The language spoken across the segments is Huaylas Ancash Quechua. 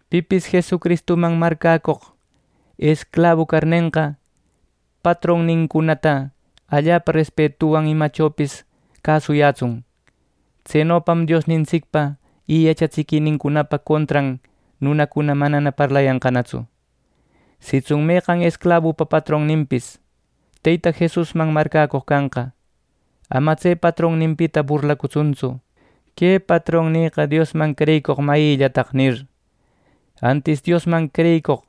Pipis Jesucristuman marcäcoq esclabu carnenqa, patronnincunata allapa respetuwan imachopis cäsuyätsun. Tsenopam Diosnintsicpa y yachatsiquinincunapa contran nunacuna manana parlayanqanatsu. Sitsun meqan esclabupa patronninpis Teyta Jesusman marcäcoq canqa, ama tse patronninpita burlacutsuntsu “¡Que patronnïqa Diosman creyicoq mayïllataq!” nir. Antis Diosman creyicoq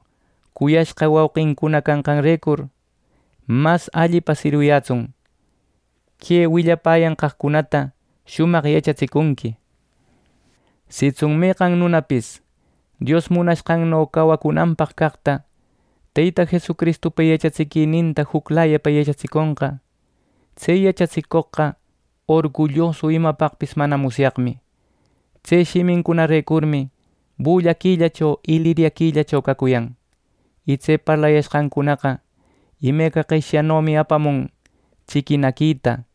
cuyashqa wauqincuna canqanrecur, mas allipa sirwiyätsun. Que willapanqaqcunata shumaq yachatsicunqui. Sitsun meqan nunapis Dios munashqanno cawacunapaq caqta Teyta Jesucristupa yachatsiquininta juclayapa yachatsiconqa, tse yachatsicoqqa orgullosu imapis mana musyaqmi. Tse shimincunarecurmi bullaquillacho y liryaquillacho cacuyan. Y tse parlashqancunaqa imeca qeshyanomi apamun, chiquinaquita,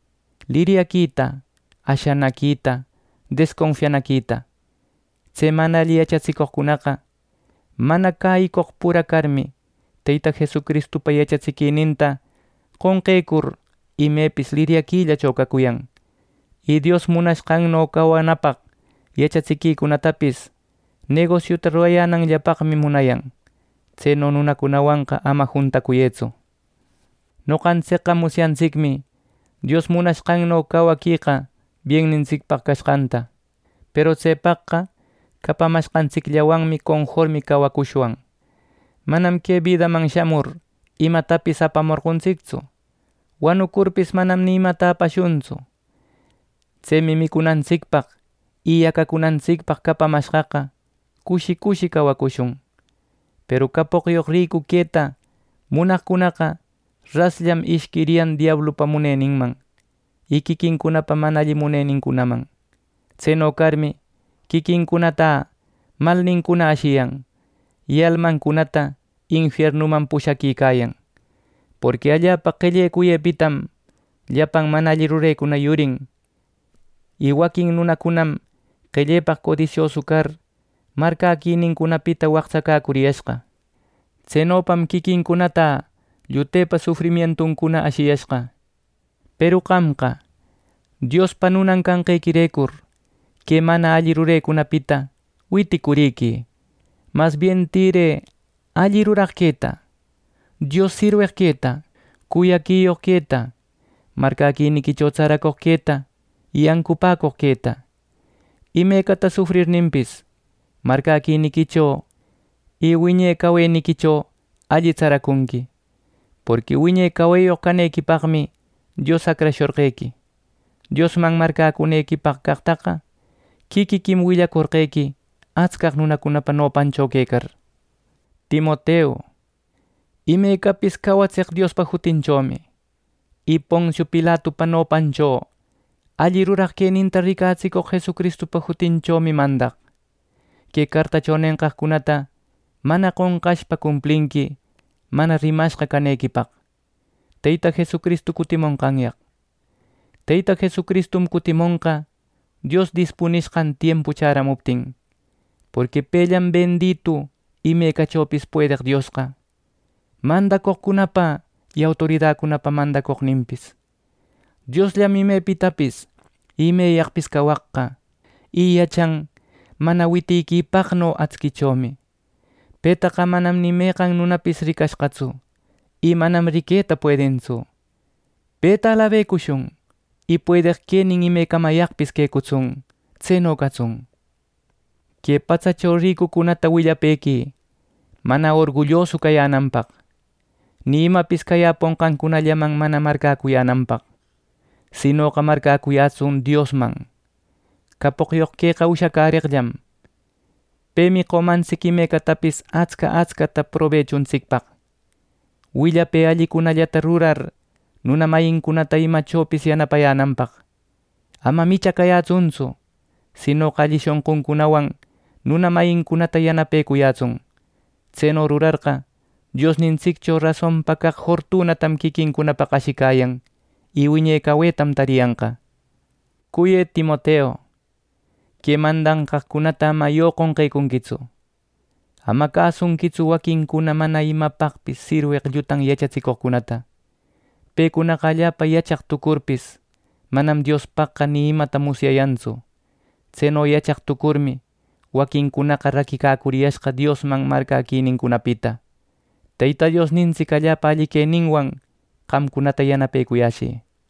liryaquita, ashanaquita, desconfianaquita. Tse mana alli yachatsicoqcunaqa mana cäyinacoq pura carmi, Teyta Jesucristupa yachatsiquininta qonqecur, imepis liryaquillacho cacuyan. Y Dios munashqanno cawanapaq yachatsiquicunatapis, negosiuta ruracuyänanllapaqmi munayan. ˻Tseno nunacunawanqa ama juntacuyëtsu.˼ Noqantsicqa musyantsicmi Dios munashqanno cawaqueqa biennintsicpaq canqanta, peru tsepaqqa capamanqantsicllawanmi conformi cawacushwan. Manam que bidaman shamur imatapis apamorqantsictsu; wanucurpis manam ni imata apashuntsu. Tsemi micunantsicpaq y yacacunantsicpaq capamashqaqa, cushi cushi cawacushun. Peru capoqyoq ricu queta munaqcunaqa rasllam ishquiriyan diablupa muneninman y quiquincunapa mana alli munenincunaman. Tseno carmi, quiquincunatä malnincuna ashiyan, y almancunata infiernuman pushaquicayan. Porqui allapa qelle cuyepitam llapan mana alli rurecuna yurin. Y waquin nunacunam qellepaq codisiosu car, marcäquinincunapita waqtsacäcuriyashqa. Tsenopam quiquincunatä llutepa sufrimientuncuna ashiyashqa. Peru qamqa, Diospa nunan canqequirecur que mana alli rurecunapita witicuriquï. Mas bien tïrë alli ruraq queta, Dios sirweq queta, cuyaquiyoq queta, marcäquiniquicho tsaracoq queta y ancupäcoq queta. Imecata sufrirninpis, marcäquiniquicho, y wiñe caweniquicho alli tsaracunqui. Porqui wiñe caweyoq canequipaqmi Dios acrashorqequi. Diosman marcäcunequipaq caqtaqa, quiquiquim willacorqequi atscaq nunacunapa nopancho quecar. Timoteu, imecapis cawatseq Diospa jutinchomi y Poncio Pilatupa nopancho alli ruraq queninta ricatsicoq Jesucristupa jutinchomi mandaq: Que cartacho nenqaqcunata mana qonqashpa cumplinqui mana rimashqa canequipaq, Teyta Jesucristu cutimonqanyaq. Teyta Jesucristum cutimonqa Dios dispunishqan tiempu chäramuptin, porqui pellam benditu imecachopis puedeq Diosqa, mandacoqcunapa y autoridacunapa mandacoqninpis. Diosllam imepitapis y imeyaqpis cawaqqa, y yachan mana witiquipaqno actsichomi. Petaqa manam ni meqan nunapis ricashqatsu, y manam riqueta puedintsu. ¡Peta alabecushun, y puedeq quenin imecamayaqpis quecutsun! Tseno catsun. Que patsacho ricucunata willapëquï, mana orgullosu cayänanpaq, ni imapis cayäpoqnincunallaman mana marcäcuyänanpaq; sinoqa marcäcuyätsun Diosman. Capoqyoq queqa ushacäreqllam. Pemi qomantsic imecatapis atsca atscata probechuntsicpaq. Willapë allicunallata rurar nuna mayincunata imecachopis yanapayänanpaq. Ama micha cayätsuntsu; sinoqa alli shonquncunawan nuna mayincunata yanapecuyätsun. Tseno rurarqa, Diosnintsiccho rasonpa caq fortunatam quiquincunapaq ashicayan, y wiñe cawetam tariyanqa. Cuyë Timoteu, que mandanqaqcunata ¡Ama yö qonqecunquitsu! Ama cäsunquitsu waquincuna mana imapaqpis sirweq llutan yachatsicoqcunata. Pecunaqa allapa yachaq tucurpis, manam Diospaqqa ni imata musyayantsu. Tseno yachaq tucurmi, waquincunaqa raquicacuriyashqa Diosman marcäquinincunapita. Teyta Diosnintsic allapa alli queninwan qamcunata yanapecuyäshï.